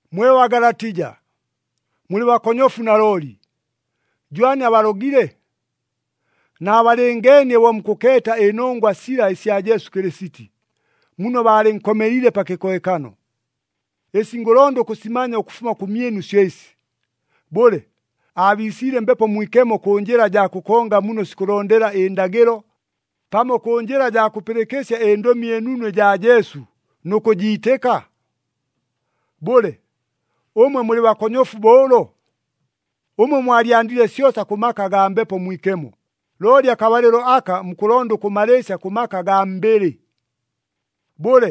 Mwe Bagalatija, mulɨ bakonyofu nalooli! Jwani abalogile? Naabalɨngeenie bo mukʉkeeta ɨnongwa sila ɨsya Jesu Kɨlɨsiti, muno baalɨnkomeliile pa kɨkohekano. Ɨsi ngʉlonda ʉkʉsimanya ʉkʉfuma kʉmyɨnu syo ɨsi. Bʉle, aabiisiile Mbepo Mwikemo kʉ njɨla jaa kʉkonga muno sikʉlondela ɨndagɨlo, pamo kʉ njɨla jaa kʉpɨlɨkɨsya ɨNdʉmi ɨNunu ɨjaa Jesu nʉ kʉjiitɨka? Bʉle, ʉmwe mulɨ bakonyofu bo ʉlo? Ʉmwe mwalyandile syosa kʉ maka agaa Mbepo Mwikemo, looli akabalɨlo aka mukʉlonda ʉkʉmalɨɨsya kʉ maka agaa mbɨlɨ. Bʉle,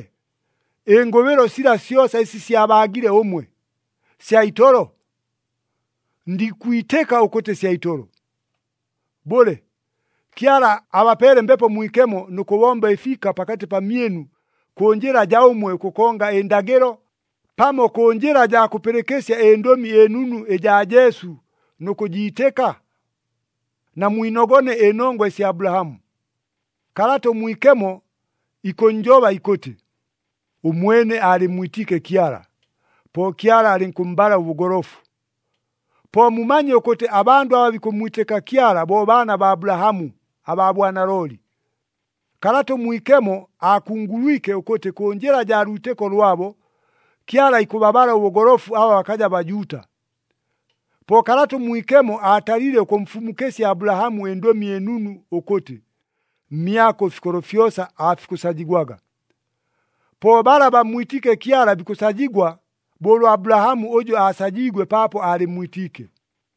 ɨngʉbɨlo sila syosa ɨsi syabaagile ʉmwe, sya itolo? Ndikwitɨka ʉkʉtɨ sya itolo! Bʉle, Kyala abapeele Mbepo Mwikemo nʉ kʉbomba ɨfiika pakatɨ pamyɨnu kʉ njɨla jaa ʉmwe ʉkʉkonga ɨndagɨlo, pamo kʉ njɨla jaa kʉpɨlɨkɨsya ɨNdʉmi ɨNunu ɨjaa Jesu nʉ kʉjiitɨka? Namwinogone ɨnongwa ɨsya Abulahamu. Kalata ʉMwikemo ikʉnnjoba ikʉtɨ, “Ʉmwene aalɨmmwitiike Kyala, po Kyala alɨnkʉmmbala ʉbʉgolofu.” Po mumanye ʉkʉtɨ, abandʉ aba bikʉmmwitɨka Kyala bo baana baa Abulahamu abaa bwanalooli! Kalata ʉMwikemo aakungulwike ʉkʉtɨ kʉ njɨla jaa lwitɨko lwabo, Kyala ikʉbabala ʉbʉgolofu aba bakaja Bajuuta. Po Kalata ʉMwikemo aatalile ʉkʉmfumukɨsya Abulahamu ɨNdʉmi ɨNunu ʉkʉtɨ, “Mmyako ɨfikolo fyosa aafikʉsajigwaga.” Po bala bammwitiike Kyala bikʉsajigwa, bo ʉlwa Abulahamu ʉjʉ aasajiigwe paapo aalɨmmwitiike.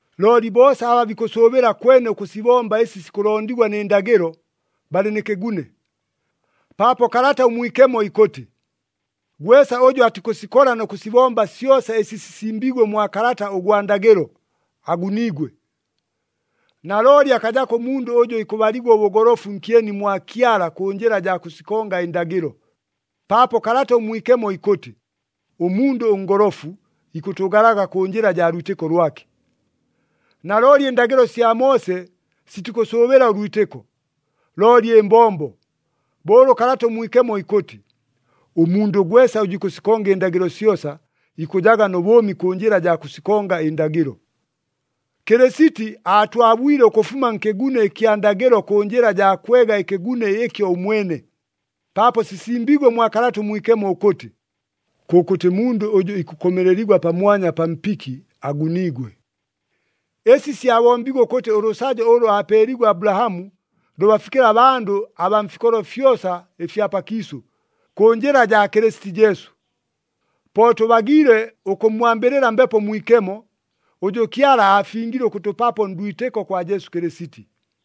Looli boosa aba bikʉsʉʉbɨla kwene ʉkʉsibomba ɨsi sikʉlondigwa nɨ ndagɨlo, balɨ nkɨgune. Paapo Kalata ʉMwikemo ikʉtɨ, “Gwesa ʉjʉ atikʉsikola nʉ kʉsibomba syosa ɨsi sisimbiigwe mwa kalata ʉgwa ndagɨlo, aguniigwe.” Nalooli akajako ʉmundʉ ʉjʉ ikʉbaligwa ʉbʉgolofu nkyeni mwa Kyala kʉ njɨla jaa kʉsikonga ɨndagɨlo, paapo Kalata ʉMwikemo ikʉtɨ, “Ʉmundʉ ʉngolofu ikʉtʉʉgalaga kʉ njɨla jaa lwitɨko lwake.” Nalooli ɨndagɨlo sya Moose sitikʉsʉʉbɨla ʉlwitɨko, looli ɨmbombo, bo ʉlʉ Kalata ʉMwikemo ikʉtɨ, “Ʉmundʉ gwesa ʉjʉ ikʉsikonga ɨndagɨlo syosa, ikʉjaga nʉ bʉʉmi kʉ njɨla jaa kʉsikonga ɨndagɨlo.” Kɨlɨsiti aatwabwile ʉkʉfuma nkɨgune ɨkya ndagɨlo kʉ njɨla jaa kwega ɨkɨgune ɨkyo ʉmwene, paapo sisimbiigwe mwa Kalata ʉMwikemo ʉkʉtɨ, “Kʉkʉtɨ mundʉ ʉjʉ ikʉkomeleligwa pamwanya pa mpiki, aguniigwe.” Ɨsi syabombiigwe ʉkʉtɨ ʉlʉsajo ʉlʉ aapeeliigwe Abulahamu, lʉbafikɨle abandʉ abaa mfikolo fyosa ɨfya pakiisʉ, kʉ njɨla jaa Kɨlɨsiti Jesu. Po tʉbagiile ʉkʉmmwambɨlɨla Mbepo Mwikemo, ʉjʉ Kyala aafingile ʉkʉtʉpapo ndwitɨko kwa Jesu Kɨlɨsiti.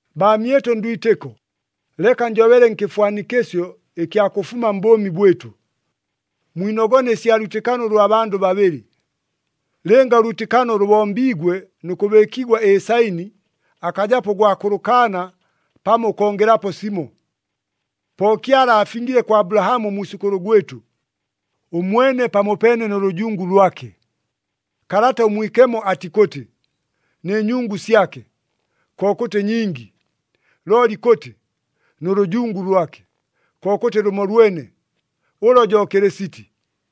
Baamyɨtʉ ndwitɨko, leka njobele nkɨfwanikɨsyo ɨkya kʉfuma mbʉʉmi bwɨtʉ. Mwinogone ɨsya lwitɨkano ʉlwa bandʉ babɨlɨ. Lɨnga ʉlwitɨkano lʉbombiigwe nʉ kʉbɨɨkigwa ɨsaini, akajapo ʉgwa kʉlʉkaana pamo ʉkongelapo simo. Po Kyala aafingile kwa Abulahamu ʉmwisʉkʉlʉ gwɨtʉ, ʉmwene pamopeene nʉ lʉjungu lwake. Kalata ʉMwikemo atikʉtɨ, “Nɨ nyungu syake,” kokʉtɨ ɨnyingi, looli ikʉtɨ, “Nʉ lʉjungu lwake,” kokʉtɨ lʉmolwene, ʉlo jo Kɨlɨsiti.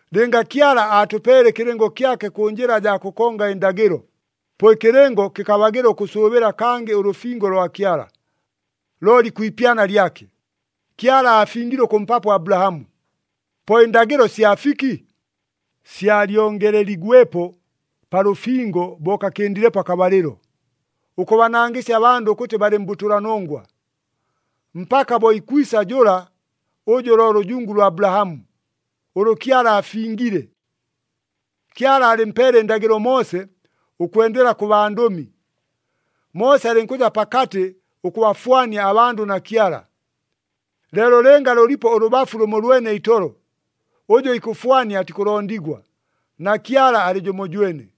Lɨnga Kyala aatʉpeele ɨkɨlɨngo kyake kʉ njɨla jaa kʉkonga ɨndagɨlo, po ɨkɨlɨngo kɨkabagɨla ʉkʉsʉʉbɨla kangɨ ʉlʉfingo lwa Kyala. Looli kwi ipyana lyake, Kyala aafingile ʉkʉmpapo Abulahamu. Po ɨndagɨlo sya fiki? Syalyongeleligwepo pa lʉfingo bo kakɨndilepo akabalɨlo, ʉkʉbanangɨsya abandʉ ʉkʉtɨ balɨ mbʉtʉlanongwa, mpaka bo ikwisa jʉla ʉjʉ lo lʉjungu lwa Abulahamu, ʉlʉ Kyala aafingile. Kyala aalɨmpeele ɨndagɨlo Moose ʉkwendela kʉ bandʉmi. Moose alɨnkʉja pakatɨ ʉkʉbafwania abandʉ na Kyala. Leelo lɨnga lʉlipo ʉlʉbafu lʉmolwene itolo, ʉjʉ ikʉfwania atikʉlondigwa, na Kyala alɨ jʉmojwene.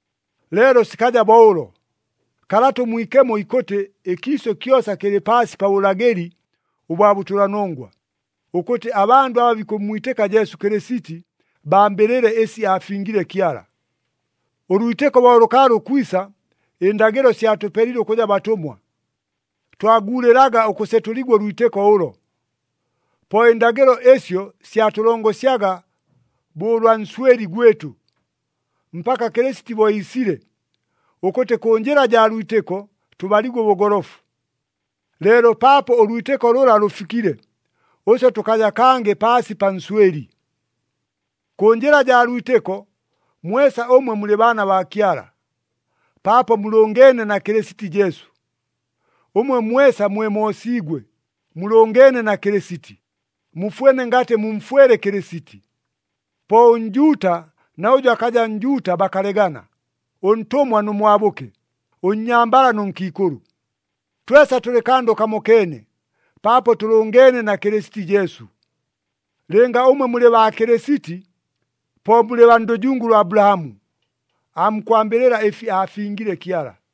Leelo sikaja bo ʉlo. Kalata ʉMwikemo ikʉtɨ ɨkiisʉ kyosa kɨlɨ paasi pa bʉlagɨli ʉbwa bʉtʉlanongwa, ʉkʉtɨ abandʉ aba bikʉmmwitɨka Jesu Kɨlɨsiti bambɨlɨle ɨsi aafingile Kyala. Ʉlwitɨko bo lʉkaalɨ ʉkwisa, ɨndagɨlo syatʉpelile ʉkʉja batʉmwa. Twaguulɨlaga ʉkʉsetʉligwa ʉlwitɨko ʉlo. Po ɨndagɨlo ɨsyo syatʉlongosyaga bo ʉlwa nswɨli gwɨtʉ, mpaka Kɨlɨsiti bo iisile, ʉkʉtɨ kʉ njɨla jaa lwitɨko tʉbaligwe ʉbʉgolofu. Leelo paapo ʉlwitɨko lʉla lʉfikile, ʉswe tʉkaja kangɨ paasi pa nswɨli. Kʉ njɨla jaa lwitɨko, mwesa ʉmwe mulɨ baana baa Kyala, paapo mulʉngeene na Kɨlɨsiti Jesu. Ʉmwe mwesa mwe moosiigwe, mulʉngeene na Kɨlɨsiti, mufwene ngatɨ mumfwele Kɨlɨsiti. Po ʉNjuuta na ʉjʉ akaja Njuuta bakalegana, ʉntʉmwa nʉ mwabʉke, ʉnnyambala nʉ nkiikʉlʉ. Twesa tʉlɨ kandʉ kamokeene, paapo tʉlʉngeene na Kɨlɨsiti Jesu. Lɨnga ʉmwe mulɨ baa Kɨlɨsiti, po mulɨ baa ndʉjungu ʉlwa Abulahamu, aamukwambɨlɨla ɨfi aafingile Kyala.